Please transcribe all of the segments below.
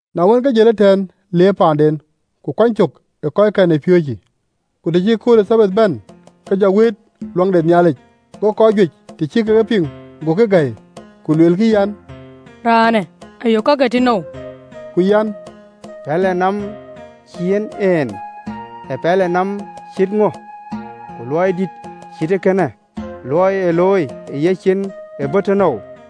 Na wën, ke jël ëtɛ̈ɛ̈n, le paanden, ku kuany cök ë kɔckɛn ë piööcë. Ku të cï kööl ë Thabath bɛ̈n, ke jɔ wëët ɣön ë Nhialic: go kɔc juëc, të cï kek e piŋ, gokï gäi, ku luelkï an, “Raanë ë yök kake tënou?” Ku an, “Pɛlënɔm cï yiɛ̈n en ee pɛlënɔm cït ŋö? Ku luɔi dïït cït ee kënë, luɔi ee looi ë yeciin ë bɔ̈ tënou?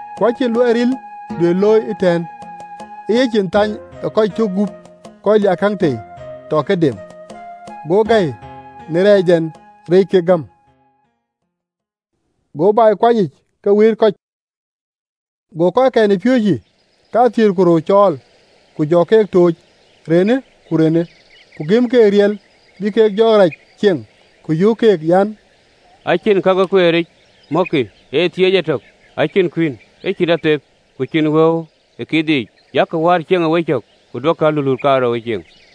Ku acïn luɔi ril duëër looi ëtɛ̈ɛ̈n ee yecin thany ë kɔc tök gup kɔc liaakäŋ tei, tɔ ke dem. Go gäi në reecdɛn reec kek gäm. Go bɛ̈i kuany yiic ke wëët kɔc. Go kɔckɛn ë piööcë kathiëër ku rou cɔɔl, ku jɔ keek tooc renë ku renë, ku gëm keek riɛl bï kek jɔɔk rac cieŋ, ku yöök keek an, “Ë cïn ka ke kueeric mɔ̈kkï, ee thiëëc etök, ë cïn kuïn, ë cïn athep, ku cïn wëu ë kiithic, yak war cieŋ ë wecök, ku duökï aluluut kaarou ee cieŋ.”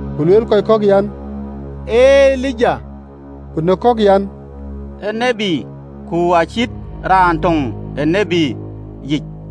Ku lueel kɔc kɔ̈k an, “Ee Elija.” Ku në kɔ̈k an, “Ee tiët, ku acït raan töŋ ë tït yiic.”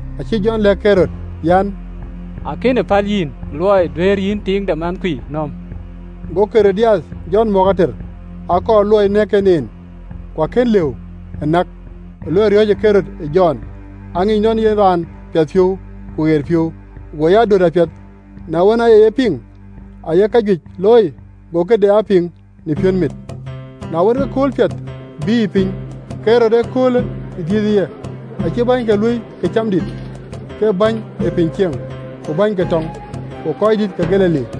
Acï Jɔn lɛ̈k Ɣerod an, “Akënë päl yïn luɔi duëër yïn tiiŋ de mɛnhkui nööm.” Go Ɣerodiath Jɔn mɔ̈k ater, akɔɔr luɔi nɛ̈k en en, ku kën lëu ë näk: luɔi riɔ̈ɔ̈cë Ɣerod ë Jɔn, aŋic nɔn ee yen raan piɛthpiɔ̈u ku ye raan ɣeric, go ya döt apiɛth. Na wën, aye yen piŋ, aaye kajuëc looi, go këde aa piŋ në piɔ̈nmit. Na wën, ke kööl piɛth bïïyë piny: Ɣerod, ëköölë dhiëthë ye, acï bänyke luöi këcamdït, ke bäny ë piny cieŋ, ku bäny ke tɔŋ, ku röördït ke Galili,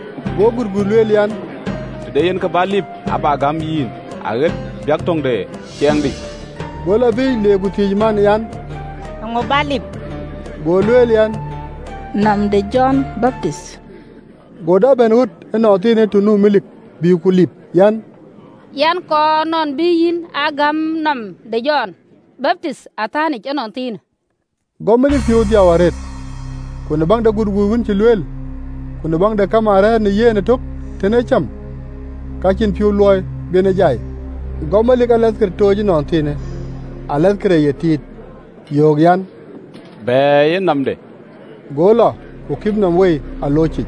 Go gutguut lueel an, “Të de yen kë bä lip, abä gäm yïn, aɣët biäk töŋ de ciɛɛŋdï.” Go lɔ biic, le ku thiëëc man an, “Eeŋö bä lip?” Go lueel an, “Nɔm de Jɔn Baptith.” Go dap bɛ̈n ɣöt ënɔnthiinë të nu melik, bïï ku lip an, “Yɛn kɔɔr nɔn bï yïn a gäm nɔm de Jɔn Baptith ë atɛ̈nyic ënɔnthiinë!” Go melik piɔ̈u dhiau arëët, ku në baŋ de gutguut wën cï lueel, ku në baŋ de kamaan rɛ̈ɛ̈r në yen ëtök tën ee cam, ka cïn piɔ̈u luɔi bï en jai. Go melik alathkër tooc ënɔnthiinë, alathkër ë ye tiit, yöök an, bɛ̈ɛ̈iyë nɔmde. Go alathkër lɔ ku kip Jɔn nɔm wei ë alooc yic,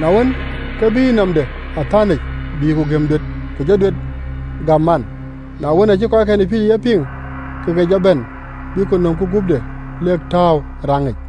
na wën, ke bïï nɔmde ë atɛ̈nyic, bïï ku gëm duet, ku jɔ duet gäm man. Na wën, aacï kɔckɛn ë piööcë ye piŋ, ke ke jɔ bɛ̈n, ku nömkï guöpde, lek tääu ë raŋic.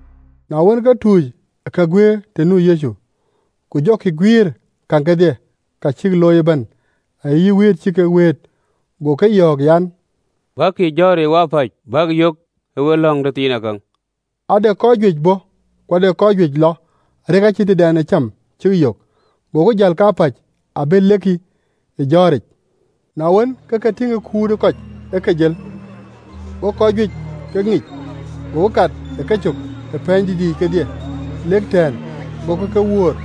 Na wën, ke tuuc ë ke guëër të nu Yecu, ku jɔkï guiëër käŋ kedhie, ka cïk looi ëbɛ̈n, ayï wëët cï kek wëët. Go ke yɔ̈ɔ̈k an, “Bäkï ë jɔ̈ɔ̈ric wapäc, bäk yök ë we lɔ̈ŋ tëthiinakäŋ.” Ade kɔc juëc bɔ̈ ku ade kɔc juëc lɔ, arëk acïn tëdɛn ë cäm cïk yök. Gokï jäl kapäc ë abël lekï ë jɔ̈ɔ̈ric. Na wën, ke ke tïŋ kut ë kɔc ë ke jël, go kɔc juëc ke ŋic, gokï kat ë kecök ë wuöt yiic kedhie, lek tɛ̈ɛ̈n, agokï ke wöör.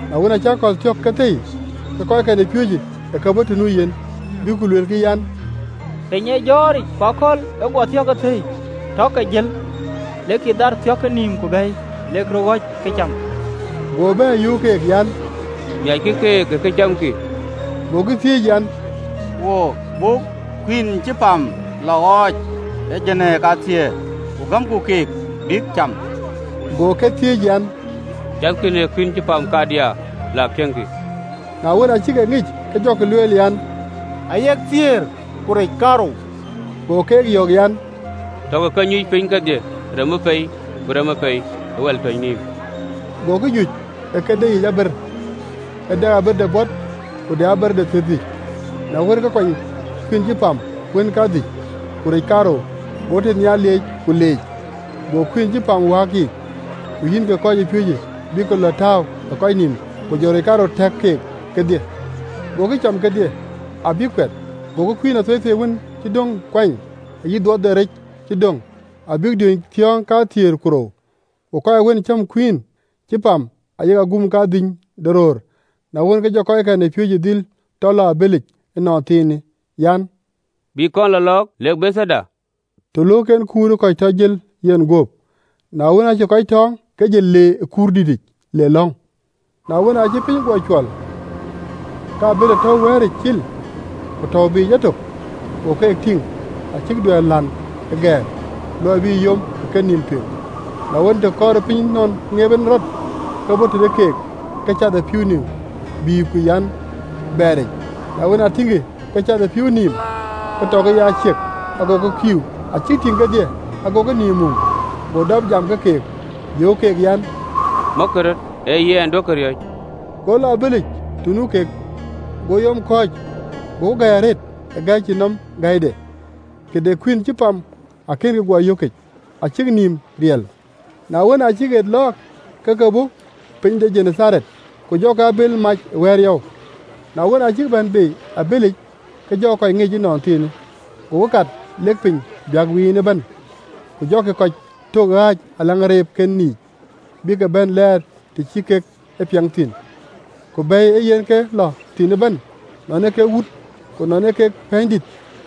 Na wën, aacï akɔ̈l thiɔ̈k ke thëi, ke kɔckɛn ë piööcë ë ke bɔ̈ të nu yen, bïk ku luelkï an, “Piny ee jɔ̈ɔ̈ric, ku akɔ̈l ë guɔ thiɔ̈k ke thëi. Tɔ ke jël, lekï dhaar thiɔ̈ke nïïm ku bɛ̈i, lek röt ɣöc këcam.” Go bɛ̈ɛ̈r, yöök keek an, “Miackï keek ë këcamkï.” Gokï thiëëc an, “Buk kuïn cï pam lɔ ɣɔɔc ë jinii kathiëër, ku gëmku kek bïk cam?” Go ke thiëëc an, “Cathkï në kuïïn cï pam kadiaa? Lak tiëŋkï.” Na wën, aa cïk e ŋic, ke jɔkï lueel an, “Ayek dhïc, ku rec kaarou.” Go keek yɔ̈ɔ̈k an, “Takï ke nyuc piny kedhie remë pei ku remë pei, ë wɛl tɔ̈c nïïm. Gokï nyuc ë ke deyiic aber, ee dɛ aber de bɔt, ku de aber de thiërdhïc. Na wën, ke kuany kuïïn cï pam wën kadhïc ku rec kaarou, go tënhial lieec, ku leec Nhialic, go kuïïn cï pam wääk yiic: ku yïn ke kɔcpiööcë bïk ke lɔ tääu ë kɔc nïïm, ku jɔ rec kaarou tɛ̈k keek kedhie. Gokï cam kedhie, abïk kuɛth. Gokï kuïn athueithuei wën cï döŋ kuany, ayï dhuɔth de rec cï döŋ, abïk diööny thiɔ̈ɔ̈ŋ kathiëër ku rou. Ku kɔc wën cam kuïïn cï pam ayek aguum kadhïny de röör. Na wën, ke jɔ kɔckɛn ë piööcë dhil tɔ lɔ abëlic ënɔnthiinë an, bïk kɔn lɔ lɔɔk lek Bethaida, të löök en kut ë kɔc tɔ jël yenguöp. Na wën, aacï kɔc tɔ̈ɔ̈ŋ, ke jël le ë kuurdït nɔm le lɔ̈ŋ. Na wën, aacï piny guɔ cuɔl, ke abël tɔ̈u ë wɛ̈ɛ̈ric cil, ku tɔ̈u Yecu biic etök. Go keek tïŋ, acïk duɛ̈ɛ̈r län ë gɛ̈ɛ̈r, luɔi bï yom ë kenïïm tueŋ. Na wën, të kɔɔrë piny nɔn ŋeep en rɔt, ke bɔ̈ tëde keek, ke cath ë pïïu nïïm, bï ku an, bɛɛric: na wën, aa tïŋkï ke cath ë pïïu nïïm, ke tɔkï ye aciëk, agokï kïïu: acïk tïŋ kedhie, agokï nïïm mum. Go dap jam ke keek, yöök keek an, “Mɔ̈kkï röt: ee yɛn, duökï riɔ̈c!” Go lɔ ë abëlic të nu kek, go yom kɔ̈ɔ̈c: gokï gäi arëët ë gäi cïn nɔm gäide, këde kuïïn cï pam akënkï guɔ yökic, acïk nïïm riɛl. Na wën, aa cïk ɣet lɔɔk, ke ke bɔ̈ piny de Genetharet, ku jɔkï abël mac ë wɛ̈ɛ̈r yɔu. Na wën, aa cïk bɛ̈n bei ë abëlic, ke jɔ kɔc ŋic ënɔnthiinë, gokï kat lek piny biäkë wiin ëbɛ̈n, ku jɔkï kɔc tök ɣääc ë ageenken yiic, bïk ke bɛ̈n lɛɛr të cï kek e piɛŋ thïn. Ku bɛ̈i ee yen ë ke lɔ thïn ëbɛ̈n, nɔn ee kek wuöt, ku nɔn ee kek pɛ̈ɛ̈nydït,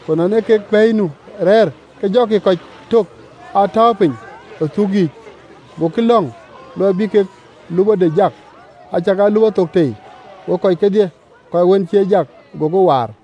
ku nɔn ee kek bɛ̈i nu rɛɛr, ke jɔkï kɔc tök aa tääu piny ë thuk yiic, gokï lɔ̈ŋ luɔi bï kek lupɔde jak, acakaa lupɔ thok tei: go kɔc kedhie kɔc wën cï ë jak gokï waar.